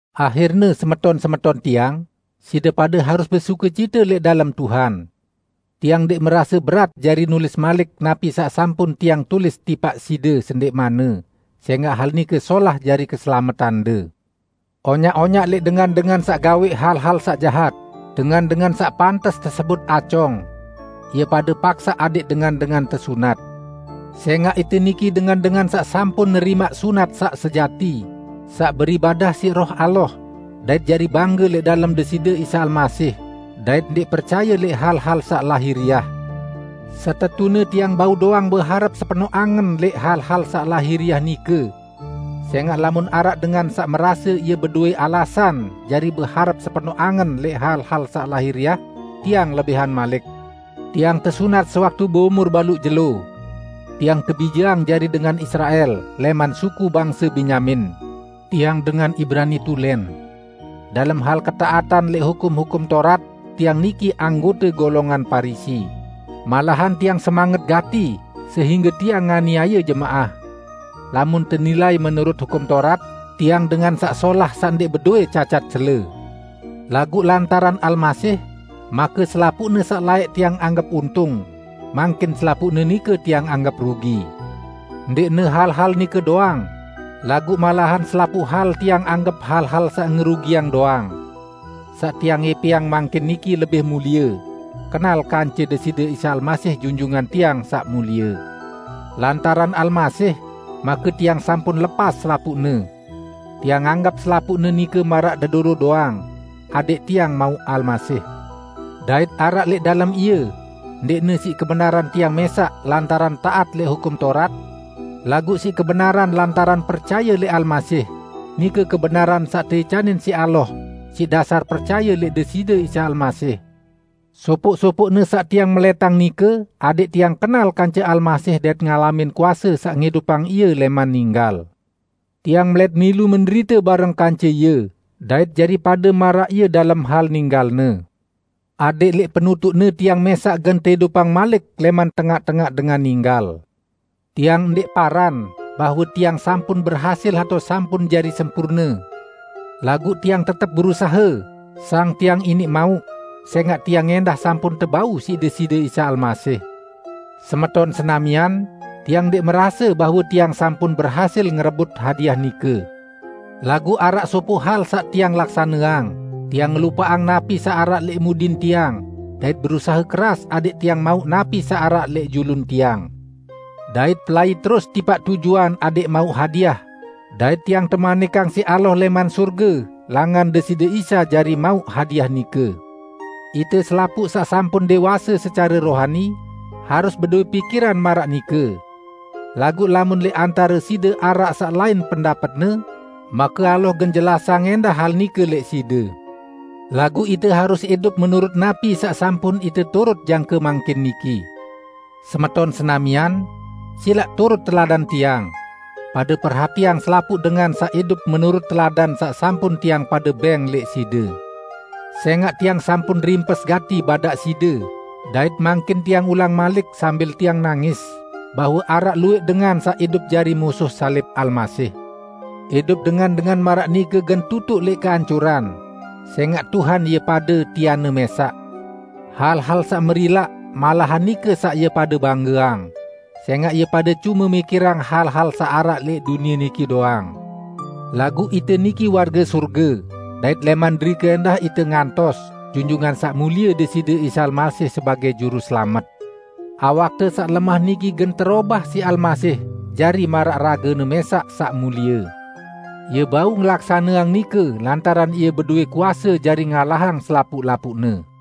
Ahirne, semeton-semeton tiang, side pade harus besukecite lẽq dalem Tuhan. Tiang ndẽq merase berat jari nulis malik napi saq sampun tiang tulis tipaq side sendẽqmanne; sẽngaq hal nike solah jari keselametande. Onyaq-onyaq lẽq dengan-dengan saq gawẽq hal-hal saq jahat, dengan-dengan saq pantes tesebut acong. Ie pade paksaq adẽq dengan-dengan tesunat. Sẽngaq ite niki dengan-dengan saq sampun nerimaq sunat saq sejati, saq beribadah siq Roh Allah, dait jari bangge lẽq dalem Deside Isa Almasih dait ndẽq percaye lẽq hal-hal saq lahiriah. Setetune tiang bau doang beharep sepenoq angen lẽq hal-hal saq lahiriah nike. Sẽngaq lamun araq dengan saq merase ie bedowẽ alasan jari beharep sepenoq angen lẽq hal-hal saq lahiriah, tiang lebihan malik. Tiang tesunat sewaktu beumur baluq jelo. Tiang tebijeang jari dengan Israel, lẽman suku bangse Benyamin; tiang dengan Ibrani asli. Dalem hal ketaatan lẽq Hukum-hukum Taurat, tiang niki anggote golongan Parisi. Malahan tiang semanget gati sehingge tiang nganiaye jemaah. Lamun tenilai menurut Hukum Taurat, tiang dengan saq solah saq ndẽq bedowẽ cacat cele. Laguq lantaran Almasih, make selapuqne saq laẽq tiang anggep untung, mangkin selapuqne nike tiang anggep rugi. Ndẽqne hal-hal nike doang; laguq malahan selapuq hal tiang anggep hal-hal saq ngerugiang doang. Saq tiang ẽpẽang mangkin niki lebih mulie: Kenal kance Deside Isa Almasih, Junjungan tiang Saq Mulie. Lantaran Almasih, make tiang sampun lepas selapuqne. Tiang anggep selapuqne nike maraq dedoro doang, adẽq tiang mauq Almasih, dait araq lẽq dalem Ie ndẽqne siq kebenaran tiang mẽsaq lantaran taat lẽq Hukum Taurat, laguq siq kebenaran lantaran percaye lẽq Almasih, nike kebenaran saq teicanin siq Allah, siq dasar percaye lẽq Deside Isa Almasih. Sopoq-sopoqne saq tiang melẽtang nike adẽq tiang kenal kance Almasih dait ngalamin kuase saq ngidupang Ie lẽman ninggal. Tiang melẽt milu menderite bareng kance Ie dait jari pade maraq Ie dalem hal ninggal-Ne. Adẽq lẽq penutuqne tiang mẽsaq gen teidupang malik lẽman tengaq-tengaq dengan ninggal. Tiang ndẽq paran bahwe tiang sampun berhasil atao sampun jari sempurne, laguq tiang tetep berusahe, sang tiang iniq mauq, sẽngaq tiang ẽndah sampun tebau siq Deside Isa Almasih. Semeton senamian, tiang ndẽq merase bahwe tiang sampun berhasil ngerebut hadiah nike. Laguq araq sopoq hal saq tiang laksaneang, tiang ngelupaqang napi saq araq lẽq mudin tiang, dait berusahe keras adẽq tiang mauq napi saq araq lẽq julun tiang. Dait pelai terus tipaq tujuan adẽq mauq hadiah, dait tiang temanikang siq Allah lẽman sorge langan Deside Isa jari mauq hadiah nike. Ite selapuq saq sampun dẽwase secare rohani, harus bedowẽ pikiran maraq nike. Laguq lamun lẽq antare side araq saq lain pendapetne, make Allah gen jelasang ẽndah hal nike lẽq side. Laguq ite harus idup menurut napi saq sampun ite turut jangke mangkin niki. Semeton senamian! Silaq turut teladan tiang. Pade perhatiang selapuq dengan saq idup menurut teladan saq sampun tiang pade bẽng lẽq side. Sẽngaq tiang sampun rimpes gati badaq side, dait mangkin tiang ulang malik sambil tiang nangis, bahwe araq luwẽq dengan saq idup jari musuh salib Almasih. Idup dengan-dengan maraq nike gen tutuq lẽq keancuran, sẽngaq Tuhan ie pade, tianne mẽsaq. Hal-hal saq merilaq, malahan nike saq ie pade banggeang; sẽngaq ie pade cume mikirang hal-hal saq araq lẽq dunie niki doang. Laguq ite niki warge sorge, dait lẽman derike ẽndah ite ngantos, Junjungan Saq Mulie Deside Isa Almasih sebagẽ Juruselamet. Awakte saq lemah niki gen terobah siq Almasih jari maraq rage-Ne mẽsaq saq mulie. Ie bau ngelaksaneang nike lantaran Ie bedowẽ kuase jari ngalahang selapuq-lapuqne.